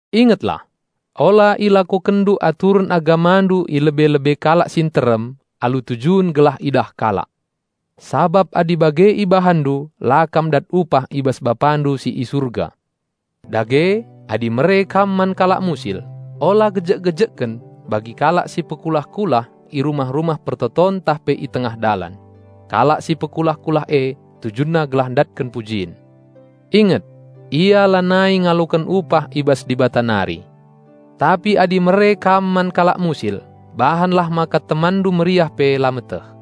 "Ingetlah! Ola ilakokenndu aturen agamandu i lebe-lebe kalak si nterem alu tujun gelah idah kalak. Sabap adi bage ibahanndu la kam dat upah i bas Bapandu si i Surga. Dage, adi mere kam man kalak musil, ola gejek-gejekken bagi kalak si pekulah-kulah i rumah-rumah persembahen ntah pe i tengah dalan. Kalak si pekulah-kulah e tujunna gelah ndatken pujin. Inget! Ia lanai ngaloken upah i bas Dibata nari. Tapi adi mere kam man kalak musil, bahanlah maka temanndu meriah pe la meteh.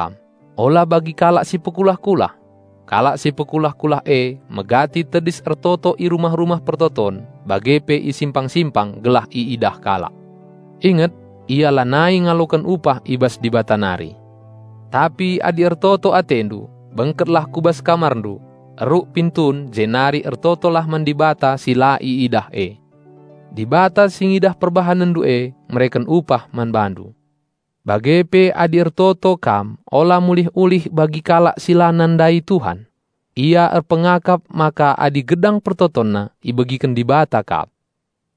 "Adi ertoto kam, ola bagi kalak si pekulah-kulah. Kalak si pekulah-kulah e megati tedis ertoto i rumah-rumah persembahen bage pe i simpang-simpang gelah iidah kalak. Inget! Ia lanai ngaloken upah i bas Dibata nari. Tapi adi ertoto atendu, bengketlah ku bas kamarndu, eruk pintun jenari ertotolah man Dibata si la iidah e. Dibata si ngidah perbahanenndu e mereken upah man bandu. Bage pe adi ertoto kam ola mulih-ulih bagi kalak si la nandai Tuhan. Ia erpengakap maka adi gedang pertotonna ibegiken Dibata kap.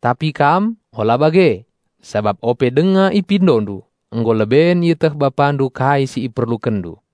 Tapi kam, ola bage. Sabap ope denga ipindondu, nggo leben ieteh Bapandu kai si iperlukenndu.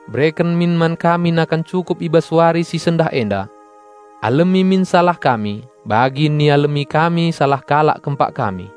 Bereken min man kami nakan cukup i bas wari si sendah enda. Alemi min salah kami bagi ialemi kami salah kalak kempak kami.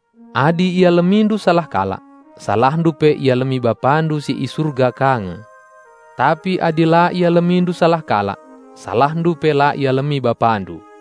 Adi ialemindu salah kalak, salahndu pe ialemi Bapandu si i Surga ka nge. Tapi adi la ialemindu salah kalak, salahndu pe la ialemi Bapandu."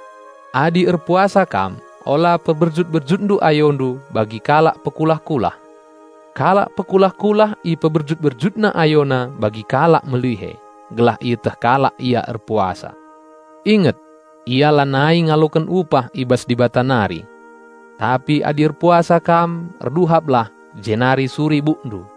"Adi erpuasa kam, ola peberjut-berjut ayondu bagi kalak pekulah-kulah. Kalak pekulah-kulah iperberjut-berjutna ayona bagi kalak melihe, gelah ieteh kalak ia erpuasa. Inget! Ia lanai ngaloken upah i bas Dibata nari. Tapi adi erpuasa kam, erduhaplah jenari suri bukndu,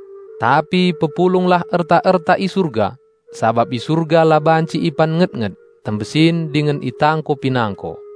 Tapi pepulunglah erta-erta i Surga. Sabap i Surga la banci ipan nget-nget, tembesin dingen itangko pinangko.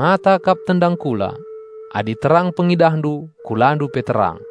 "Mata kap tendang kula. Adi terang pengidahndu, kulandu pe terang.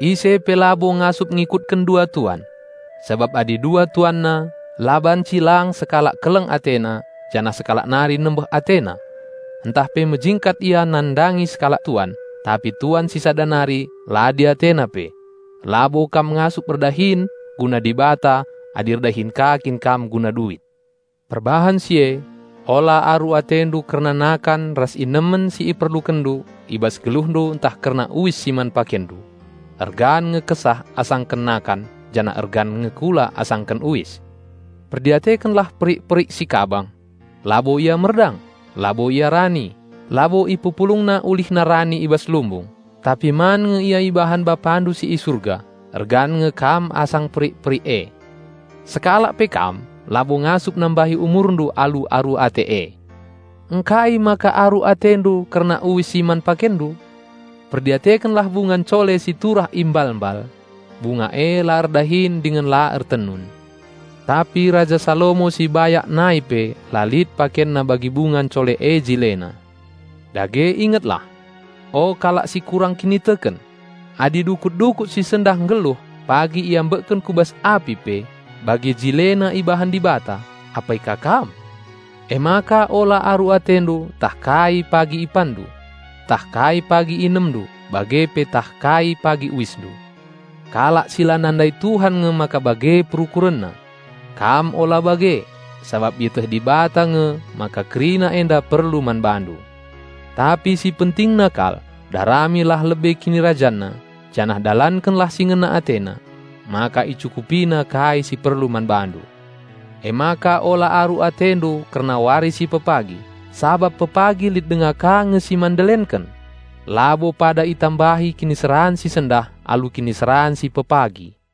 "Ise pe labo ngasup ngikutken dua tuan. Sabap adi dua tuanna, la banci lang sekalak keleng atena janah sekalak nari nembeh atena; ntah pe mejingkat ia nandangi sekalak tuan, tapi tuan si sada nari la diatena pe. Labo kam ngasup erdahin guna Dibata adi erdahin ka kin kam guna duit. Perbahan si e, ola aru atendu kerna nakan ras inemen si iperlukenndu i bas geluhndu ntah kerna uis si man pakenndu. Ergan nge kesah asa nakan janah ergan nge kula asa uis. Perdiatekenlah perik-perik kabang. Labo ia merdang, labo ia rani, labo mpepulung persedian, tapi man nge ia ibahan BapaNdu si i Surga. Ergan nge kam asa perik-perik e! Sekalak pe kam labo ngasup nambahi umurndu alu aru ate e! Ngkai maka aru atendu kerna uis si man pakenndu? Perdiatekenlah bunga ncole si turah i mbal-mbal. Bunga e la erdahin dingen la ertenun. Tapi Raja Salomo si bayak nai pe la lit pakenna bagi bunga ncole e jilena. Dage ingetlah! O kalak si kurang kiniteken! Adi dukut-dukut si sendah nggeluh pagi iambekken ku bas api pe bage jilena ibahan Dibata, apai ka kam! Emaka ola aru atendu ntah kai pagi ipanndu, ntah kai pagi inemndu bage pe ntah kai pagi uisndu. (Kalak si la nandai Tuhan nge maka bage perukurenna). Kam ula bage, sabap ieteh Dibata nge maka kerina enda perlu man bandu. Tapi si pentingna kal, daramilah lebe KinirajanNa, janah dalankenlah si ngena AteNa, maka IcukupiNa kai si perlu man bandu. Emaka ola aru atendu kerna wari si pepagi, sabap pepagi lit denga ka nge si man ndelenken. Labo pada itambahi kiniseran si sendah alu kiniseran pepagi."